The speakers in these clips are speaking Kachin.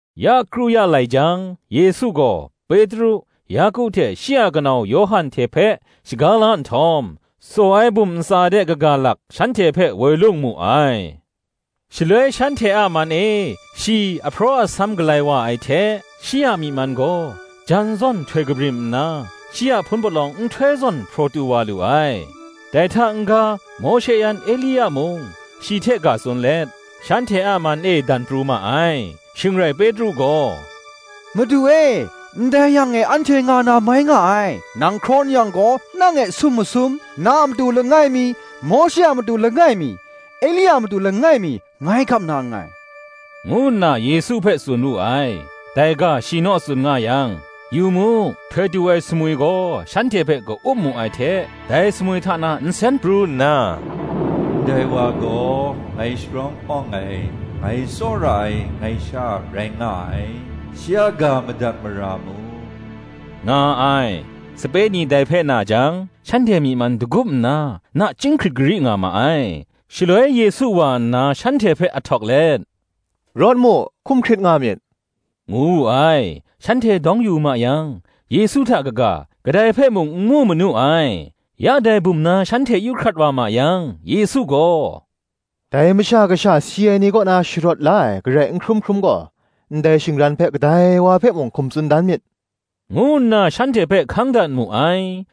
Ya kru ya lai jang, Yesu gaw, Petru, Yaku hte shi a kanau Yawhan hte hpe shaga la nhtawm, tsaw ai bum ntsa de kaga lak shanhte hpe woi lung mu ai. Shaloi shanhte a man e shi ahpraw asam galai wa ai hte, shi a myi man gaw, jan zawn htoi kabrim nna, shi a hpun palawng nhtoi zawn hpraw tu wa lu ai: dai hta n-ga Mawshe yan Elia mung, shi hte ga tsun let, shanhte a man e dan pru ma ai. Shing rai Petru gaw, “Madu e, ndai yang e anhte nga na mai nga ai: nang hkraw n yang gaw, nang e sum masum, na a matu langai mi, Mawshe a matu langai mi, Elia a matu langai mi, ngai gap na nngai,” ngu nna Yesu hpe tsun wu ai. Dai ga shi naw tsun nga yang, yu mu, htoi tu ai sumwi gaw shanhte hpe ka-up mu ai hte dai sumwi hta na nsen pru nna, “Ndai wa gaw ngai sharawng awng ai, ngai tsawra ai ngai Sha rai nga ai: shi a ga madat mara mu,” nga ai. Sape ni dai hpe na jang, shanhte myi man dagup nna, nachying hkrit gari nga ma ai. Shaloi Yesu wa nna shanhte hpe ahtawk let, “Rawt mu, hkum hkrit nga myit,” ngu wu ai. Shanhte dawng yu mu yang, Yesu hta kaga, kadai hpe mung n mu manu ai. Ya dai bum na shanhte yu hkrat wa ma yang, Yesu gaw, “Dai Masha Kasha si ai ni kaw na sharawt la ai garai n hkrum hkrum gaw, ndai shingran hpe, kadai wa hpe mung hkum tsun dan myit,” ngu nna shanhte hpe hkang dat mu ai.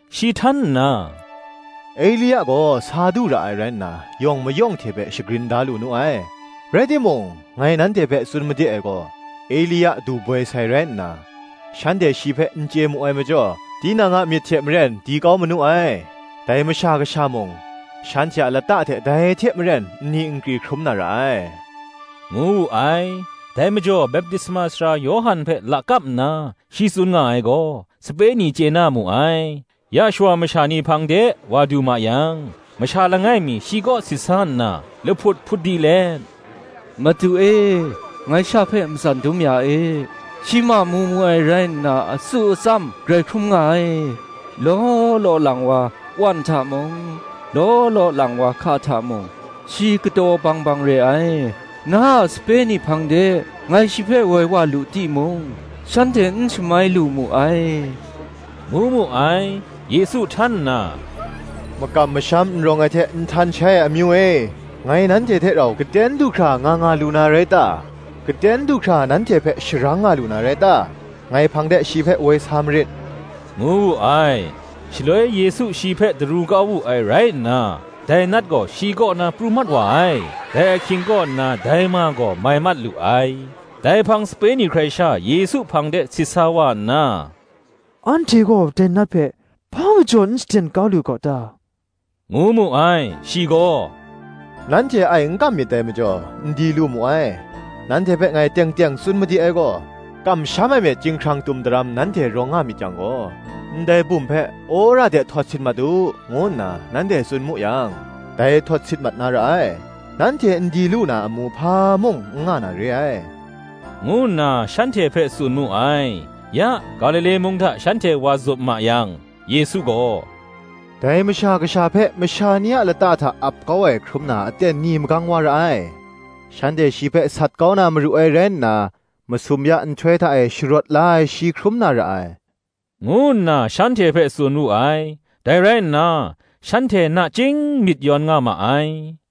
Shi htan nna, “Elia gaw sa du ra ai rai nna, yawng mayawng hte hpe shagrin da lu nu ai: rai timung, ngai nanhte hpe tsun made ai gaw, Elia du boi sai rai nna, shanhte shi hpe n chye mu ai majaw, tinang a myit hte maren di kau manu ai; dai Masha Kasha mung, shanhte a lata hte dai hte maren nni nkri hkrum na ra ai,” ngu wu ai. Dai majaw Baptisma Sara Yawhan hpe lakap nna, shi tsun nga ai gaw, sape ni chye na mu ai. Ya shawa masha ni hpang de wa du ma yang, masha langai mi shi kaw sit sa nna, lahput hput di let, “Madu e, ngai sha hpe matsan dum ya e; shi mamu mu ai rai nna, atsu atsam grai hkrum nga ai: law law lang wa wan hta mung, law law lang wa hka hta mung, shi kataw bang bang re ai: na a sape ni hpang de ngai shi hpe woi wa lu timung, shanhte n shamai lu mu ai,” ngu mu ai. Yesu htan nna “Makam masham n rawng ai hte nhtan shai ai amyu e, ngai nanhte hte rau gaten du hkra nga nga lu na rai ta? gaten du hkra, nanhte hpe sharang nga lu na rai ta? ngai hpang de shi hpe woi sa marit,” ngu wu ai. Shaloi Yesu shi hpe daru kau wu ai rai nna, dai nat gaw shi kaw na pru mat wa ai; dai ahkying kaw nna dai ma gaw mai mat lu ai. Dai hpang sape ni hkrai sha Yesu hpang de sit sa wa nna, “Anhte gaw dai nat hpe hpa majaw n shaden kau lu gaw ta?” ngu mu ai. Shi gaw, “Nanhte ai n kam myit dai majaw, n di lu mu ai; nanhte hpe ngai teng teng tsun made ai gaw; Kamsham ai myit chyinghkrang tum daram nanhte rawng nga myit yang gaw, ndai bum hpe, Wora de htawt sit mat u, ngu nna nanhte tsun mu yang, dai htawt sit mat na ra ai: nanhte n di lu na amu hpa mung n nga na re ai,” ngu nna shanhte hpe tsun mu ai. Ya, Galile mung hta shanhte wa zup ma yang, Yesu gaw, “Dai Masha Kasha hpe masha ni a lata hta ap kau ai hkrum na aten ni magang wa ra ai: shanhte shi hpe sat kau na maru ai rai nna, masum ya nhtoi hta e sharawt la ai shi hkrum na ra ai,” ngu nna shanhte hpe tsun wu ai; dai rai nna, shanhte nachying myit yawn nga ma ai.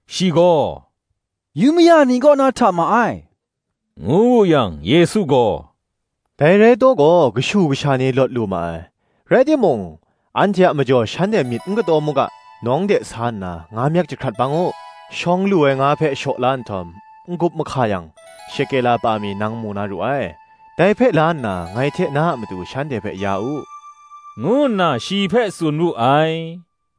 Shi gaw, “Yu maya ni kaw na hta ma ai,” ngu wu yang, Yesu gaw, “Dai rai taw gaw, kashu kasha ni lawt lu ma ai: rai timung, anhte a majaw shanhte myit n kataw mu ga, nawng de sa nna, nga myek jahkrat bang u; shawng lu ai nga hpe shaw la nhtawm, n-gup mahka yang, shekela pa mi nang mu na ru ai: dai hpe la nna, ngai hte na a matu shanhte hpe ya u,” ngu nna shi hpe tsun wu ai.